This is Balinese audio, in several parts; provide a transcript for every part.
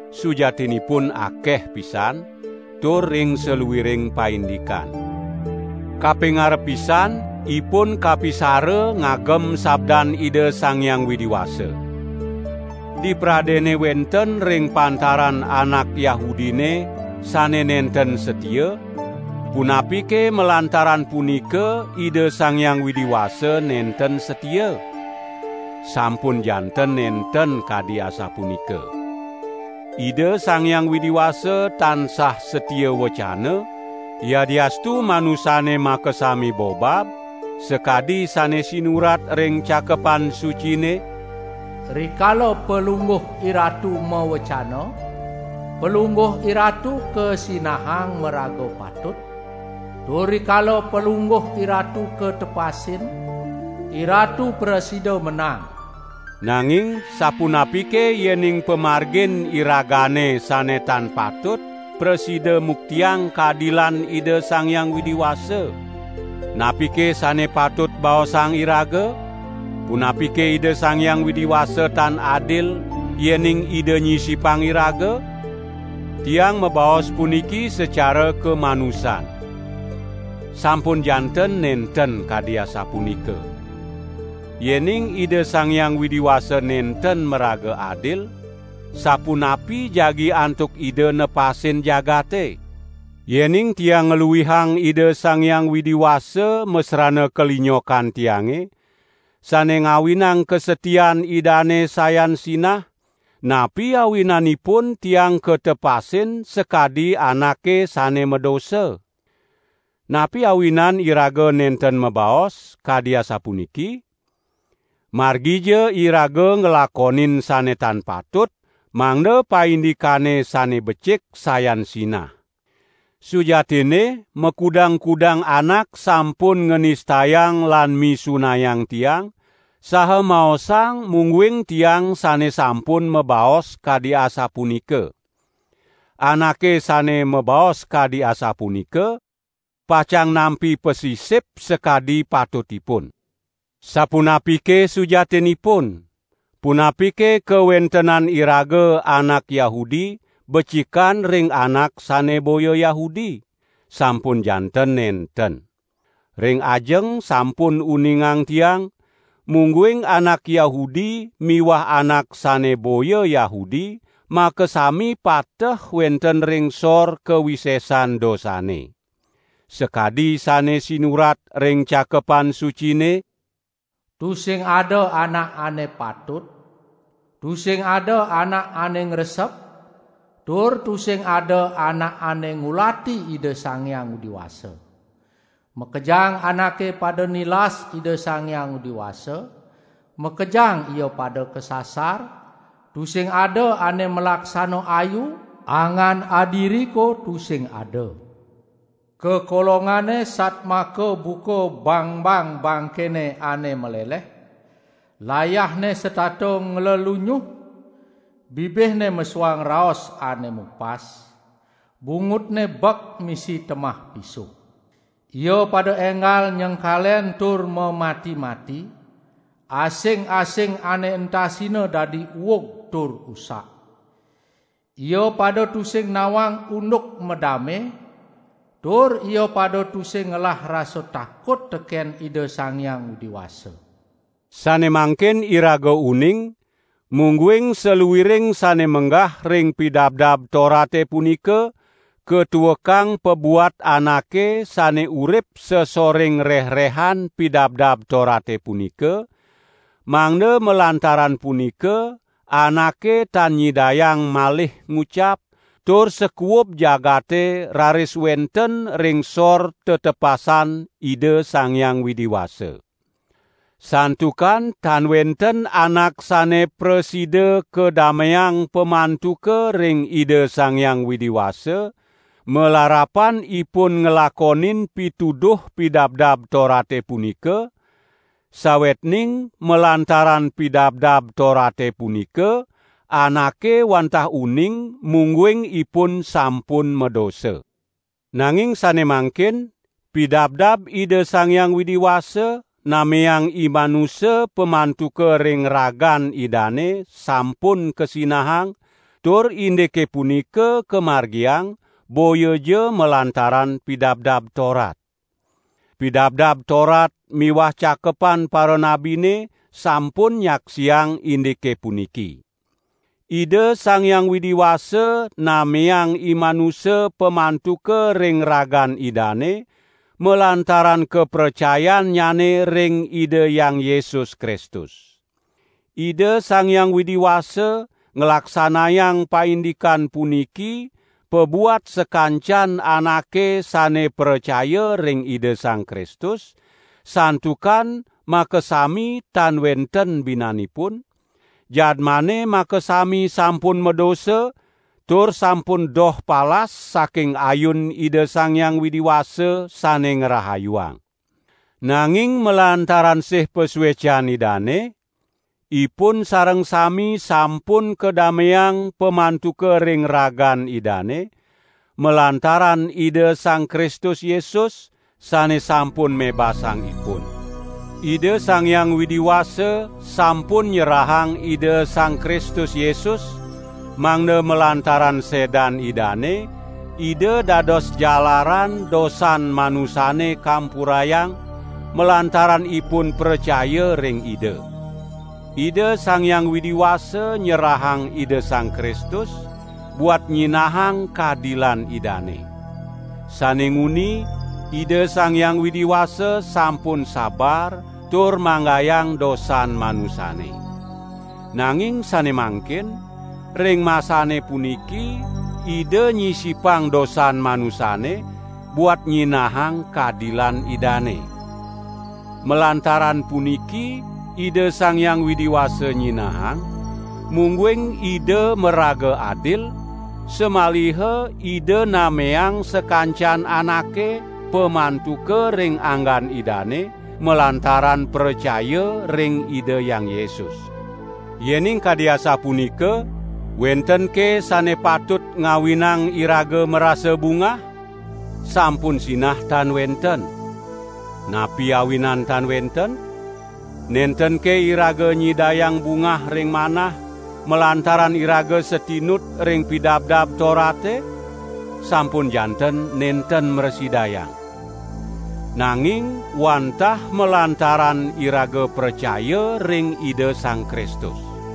Sujatinipun akeh pisan, tur ring saluiring paindikan. Kapingarep pisan ipun kapisara ngagem sabdan Ida Sang Hyang Widi Wasa. Dipradene wenten ring pantaran anak Yahudine sane nenten satia, punapike malantaran punika Ida Sang Hyang Widi Wasa nenten satia? Sampun janten nenten kadi asapunika! Ida Sang Hyang Widi Wasa tansah satia wecana, yadiastu manusane makasami bobab, sakadi sane sinurat ring Cakepan Sucine: "Rikala Palungguh IRatu mawecana, Palungguh IRatu kasinahang maraga patut, tur rikala Palungguh IRatu katepasin, IRatu prasida menang." Nanging sapunapike yening pamargin iragane sane tan patut prasida muktiang kadilan Ida Sang Hyang Widi Wasa? Napike sane patut baosang iraga? Punapike Ida Sang Hyang Widi Wasa tan adil, yening Ida nyisipang iraga? (Tiang mabaos puniki sacara kamanusan.) Sampun janten nenten kadi asapunika. Yening Ida Sang Hyang Widi Wasa nenten maraga adil, sapunapi jagi antuk Ida nepasin jagate? Yening tiang ngluihang Ida Sang Hyang Widi Wasa masrana kalinyokan tiange, sane ngawinang kasatian Idane sayan sinah, napi awinanipun tiang katepasin sakadi anake sane madosa? Napi awinan iraga nenten mabaos, kadi asapuniki: "Margija iraga nglakonin sane tan patut, mangda paindikane sane becik sayan sinah." Sujatinne makudang-kudang anak sampun nganistayang lan misunayang tiang, saha maosang mungguing tiang sane sampun mabaos kadi asapunika. Anake sane mabaos kadi asapunika, pacang nampi pasisip sakadi patutipun. Sapunapike sujatinipun? Punapike kawentenan iraga anak Yahudi becikan ring anak sane boya Yahudi? Sampun janten nenten. Ring ajeng sampun uningang tiang, mungguing anak Yahudi miwah anak sane boya Yahudi makasami pateh wenten ring sor kawisesan dosane. Sakadi sane sinurat ring Cakepan Sucine: "Tusing ada anak ane patut, tusing ada anak ane ngresep, tur tusing ada anak ane ngulati Ida Sang Hyang Widi Wasa. Makejang anake pada nilas Ida Sang Hyang Widi Wasa, makejang ia pada kasasar, tusing ada ane malaksana ayu, angan adiriko tusing ada. Kakolongane satmaka buka bangbang bangkene ane maleleh, layahne setata nglelunyuh, bibihne mesuang raos ane mupas; bungutne bek misi temah pisuh. Ia pada enggal nyengkalen tur mamati-mati; asing-asing ane entasina dadi uug tur usak. Ia pada tusing nawang unduk madame, tur ia pada tusing ngelah rasa takut teken Ida Sang Hyang Widi Wasa." Sane mangkin iraga uning, mungguing saluiring sane menggah ring Pidabdab Torate punika, katuekang pabuat anake sane urip sasoring rehrehan Pidabdab Torate punika, mangda malantaran punika anake tan nyidayang malih ngucap, tur sakuub jagate raris wenten ring sor tetepasan Ida Sang Hyang Widi Wasa. Santukan tan wenten anak sane prasida kadameang pamantuka ring Ida Sang Hyang Widi Wasa, malarapan ipun nglakonin pituduh Pidabdab Torate punika; sawetning malantaran Pidabdab Torate punika anake wantah uning mungguing ipun sampun madosa. Nanging sane mangkin, pidabdab Ida Sang Hyang Widi Wasa nameang imanusa pamantuka ring ragan Idane sampun kasinahang, tur indike punika kamargiang boyaja malantaran Pidabdab Torat. Pidabdab Torat miwah Cakepan Paranabine sampun nyaksiang indike puniki. Ida Sang Hyang Widi Wasa nameang imanusa pamantuka ring ragan Idane malantaran kapracayannyane ring Ida Hyang Yesus Kristus. Ida Sang Hyang Widi Wasa nglaksanayang paindikan puniki pabuat sakancan anake sane pracaya ring Ida Sang Kristus, santukan makasami tan wenten binanipun; jadmane makasami sampun madosa, tur sampun doh palas saking ayun Ida Sang Hyang Widi Wasa sane ngrahayuang. Nanging malantaran sih pasuecan Idane, ipun sareng sami sampun kadameang pamantuka ring ragan Idane, malantaran Ida Sang Kristus Yesus, sane sampun mebasang ipun. Ida Sang Hyang Widi Wasa sampun nyerahang Ida Sang Kristus Yesus, mangda malantaran sedan Idane, Ida dados jalaran dosan manusane kampurayang, malantaran ipun pracaya ring Ida. Ida Sang Hyang Widi Wasa nyerahang Ida Sang Kristus, buat nyinahang kadilan Idane. Sane nguni, Ida Sang Hyang Widi Wasa sampun sabar tur manggayang dosan manusane. Nanging sane mangkin, ring masane puniki Ida nyisipang dosan manusane, buat nyinahang kadilan Idane. Malantaran puniki Ida Sang Hyang Widi Wasa nyinahang, mungguing Ida maraga adil, samaliha Ida nameang sakancan anake pamantuka ring anggan Idane malantaran pracaya ring Ida Hyang Yesus. Yening kadi asapunika, wentenke sane patut ngawinang iraga marasa bungah? Sampun sinah tan wenten. Napi awinan tan wenten? Nentenke iraga nyidayang bungah ring manah, malantaran iraga satinut ring Pidabdab Torate? Sampun janten nenten mrasidayang. Nanging wantah malantaran iraga pracaya ring Ida Sang Kristus.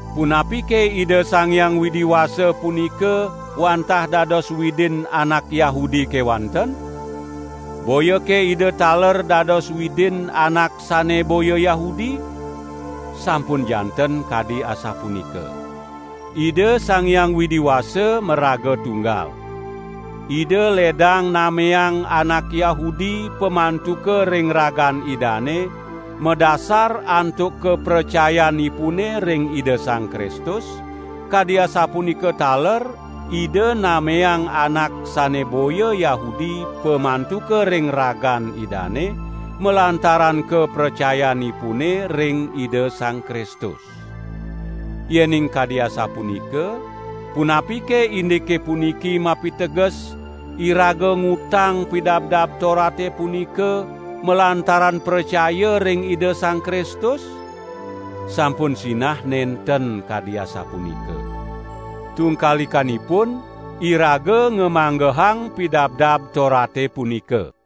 Punapike Ida Sang Hyang Widi Wasa punika wantah dados Widin anak Yahudi kewanten? Boyake Ida taler dados Widin anak sane boya Yahudi? Sampun janten kadi asapunika. Ida Sang Hyang Widi Wasa maraga tunggal. Ida ledang nameang anak Yahudi pamantuka ring ragan Idane madasar antuk kapracayanipune ring Ida Sang Kristus, kadi asapunika taler Ida nameang anak sane boya Yahudi pamantuka ring ragan Idane, malantaran kapracayanipune ring Ida Sang Kristus. Yening kadi asapunika, punapike indike puniki mapiteges iraga ngutang Pidabdab Torate punika malantaran pracaya ring Ida Sang Kristus? Sampun sinah nenten kadi asapunika. Tungkalikanipun, iraga ngamanggehang Pidabdab Torate punika.